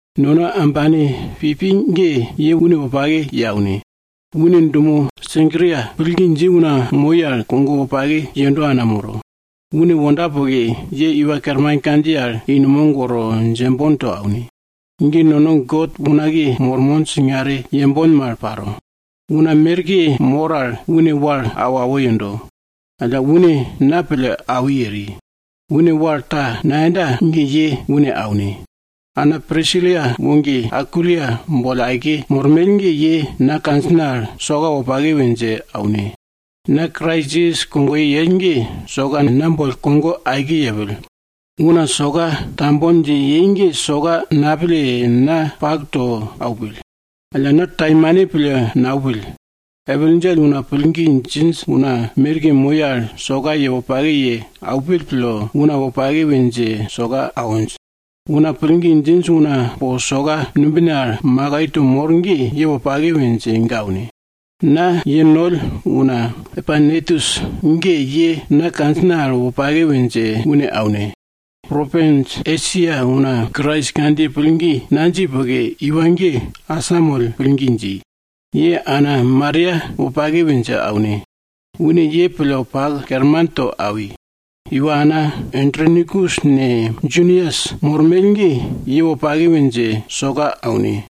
Nono ambane Pibi ge, ye une wopake ye aune. Une dumo Senkria pillgi dji una moi al, kogo wopake yendo ana moro. Une wonda poke, ye Iwa Kerman kandjiye al dje i numog woro djembon to aune. Ge nono God unakiye mormon singare yembon mal paro. Una merke mor al une wal awo awo yendo. Alla une na pille awi eri, une wal ta nayenda ge ye une aune. Ana Prisila woge Akwila boll aike mormell ge, ye na kandjina al soka wopake we dje aune. Na Krais Jisas kogoye yell ge, soka na boll kogo aike yepill. Una soka tambon dje yei ge soka napille, na pak to aupill. Alla na taimane pille naupill. Epil djell una pillgi djinj una merke moi al, soka ye wopake ye aupill pille, una wopake we dje soka awinj. Una pillgi djinj una po soka numbine al makai to mor ge, ye wopake we dje ga aune. Na ye noll una Epainetus ge, ye na kandjina al wopake we dje une aune. Propins Esia una Krais kandjiye pillgi nadji poke, iwa ge asamoll pillgi dji. Ye ana Maria wopake we dje aune. Une ye pille pak kerman to awi. Iwana Andronikus ne, Junias mormell ge, ye para wopake we dje soka aune.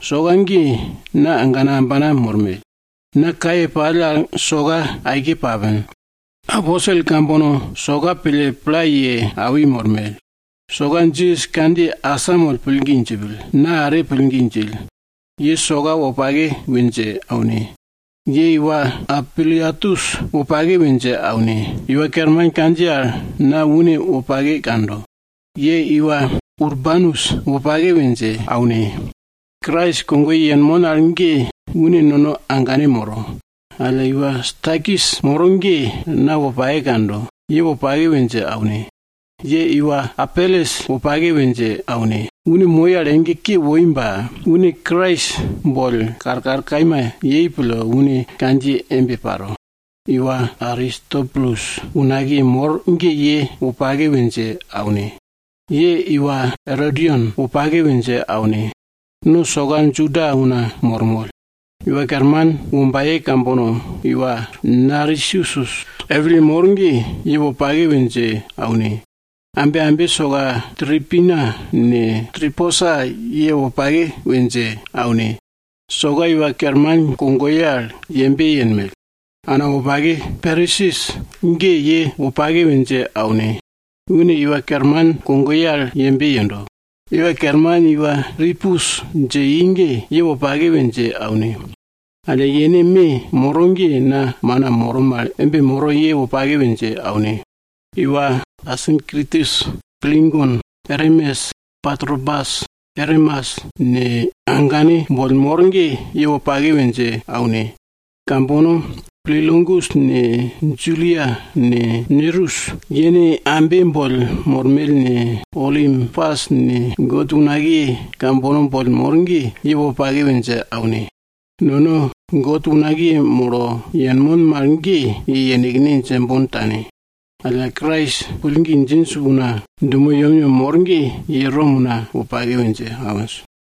Soka ge na agana ambana mormell. Na kaye pall al soka aike papin. Aposel kambono soka pille pla ye awi mormell. Soka Jisas kandjiye asamoll pillgi djipill, na are pillgi djill. Ye soka wopake we dje aune. Ye iwa Ampliatus wopake we dje aune eri. Iwa Kerman kandjiye al na une wopake kando. Ye iwa Urbanus wopake we dje aune. Krais kogoye yenmon al ge une nono agane moro. Alla iwa Stakis moro ge na wopake kando, ye wopake we dje aune. Ye iwa Apeles wopake we dje aune. Une moi al ege ke woi ba une Krais boll karkar kaima yei pille une kandjiye embe paro. Iwa Aristobulus unakiye mor ge ye para wopake we dje aune. Ye iwa Erodion wopake we dje aune. No soka Juda una mormoll. Iwa Kerman wombaye kambono iwa Narsisus epilye mor ge, ye wopake we dje aune. Ambe ambe soka Tripina ne, Triposa ye wopake we dje aune. Soka Iwa Kerman kogoye ge yembe yenmell. Ana wopake Persis ge ye wopake we dje aune. Une Iwa Kerman kogoye ge yembe yendo. Iwa Kerman iwa Rupus dje i ge, ye wopake we dje aune. Alla yene me moro ge na mana moro mal embe moro, ye wopake we dje aune. Iwa Asinkritus, Plegon, Ermes, Patrobas, Ermas, ne agane boll mor ge, ye para wopake we dje aune. Kambono Pilologus ne, Julia ne, Nereus yene ambe boll mormell ne, Olimpas ne, God unakiye kambono boll mor ge, ye wopake we dje aune. Nono God unakiye molo yenmon mal ge, ye yenekne djembon tane. Alla Krais pillgi djinj una dumo yemyem mor ge, ye Rom una wopake we dje awinj.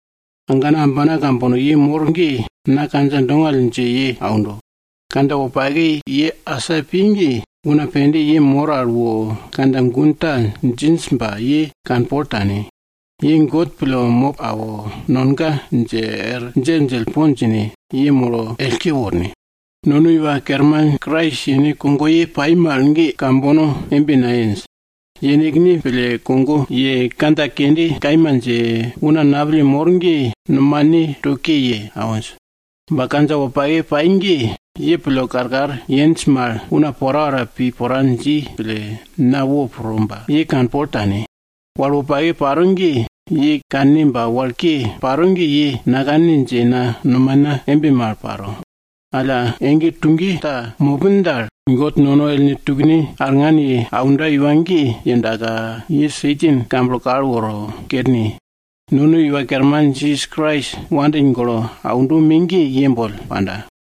Agana ambana kambono ye mor ge! Na kandja dongall dje ye aundo. Kandja wopake ye asa pi ge, una pende ye mor al wo kandja gun ta djinj, ba ye kanpol tane. Ye God pille mop awo, nonga dje er djelldjell po djine, ye molo ellke worne! Nono Iwa Kerman Krais yene kogoye pai mal ge, kambono embe nayenj. Yenekne pille kogo ye, kandja kende kaima dje, una napille mor ge nomane to ke ye awinj. Ba kandja wopake pai ge, ye pille karkar yenj mal, una porapora pi pora dji pille, na wopro ba, ye kanpol tane. Wal wopake paro ge, ye kanne ba wal ke paro ge ye nakanne dje na nomana embe mal paro. Alla ege tuge ta mopin dal, God nono ellne tukne arngan ye aundo iwa ge yewordaka, ye Satan kamblo kal woro kerne. Nono Iwa Kerman Jisas Krais wopake pille aundo me ge, ye boll panda.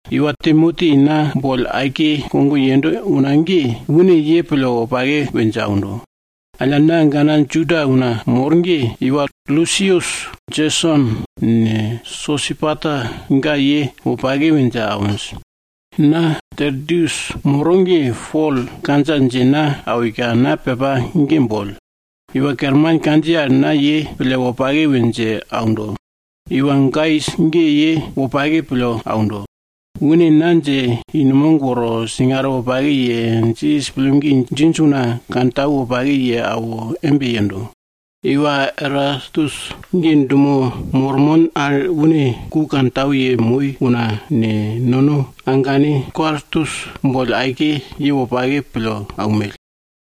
Iwa Timoti na boll aike kogo yendo una ge, une ye pille wopake we dje aundo. Alla na agana Juda una mor ge, iwa Lusius, Jeson ne, Sosipater ga ye wopake we dje awinj. Na Tertius moro ge, Pol kandja dje na awika, na pepa ge boll. Iwa Kerman kandjiye al na ye pille wopake we dje aundo. Iwa Gaius ge ye wopake pille aundo. Une na dje i numog woro singare wopake ye, Jisas pillgi djinj una kantau wopake ye awo embe yendo. Iwa Erastus ge dumo mormon al une ku kantau yemoi una ne, nono agane Kwartus boll aike ye wopake pille aunmell.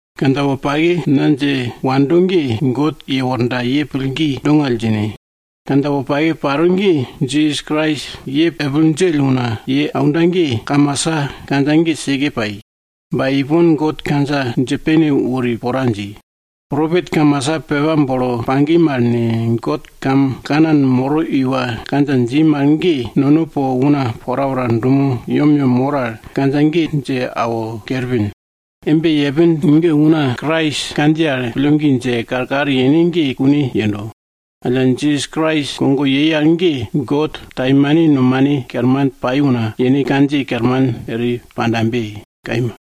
Kandja wopake na dje wando ge, God yewordaka ye pillgi dongall djine. Kandja wopake paro ge Jisas Krais ye epil djell una dje aunda ge, kamasa kandja ge seke pai. Ba ipon, God kandja dje pene wori pora dji. Propet kamasa pepa bolo pagi mal ne, God gun molo pa moro iwa kandja dji mal ge, nono po una porapora dumo yemyem mor al kandja ge dje awo kerpin. Embe yepin ge una Krais kandjiye al pillgi dje, karkar yene ge kune yendo. Alla Jisas Krais kogo yei al ge, God taimane nomane kerman pai una, yene kandjiye kerman eri pandabe. Kaima.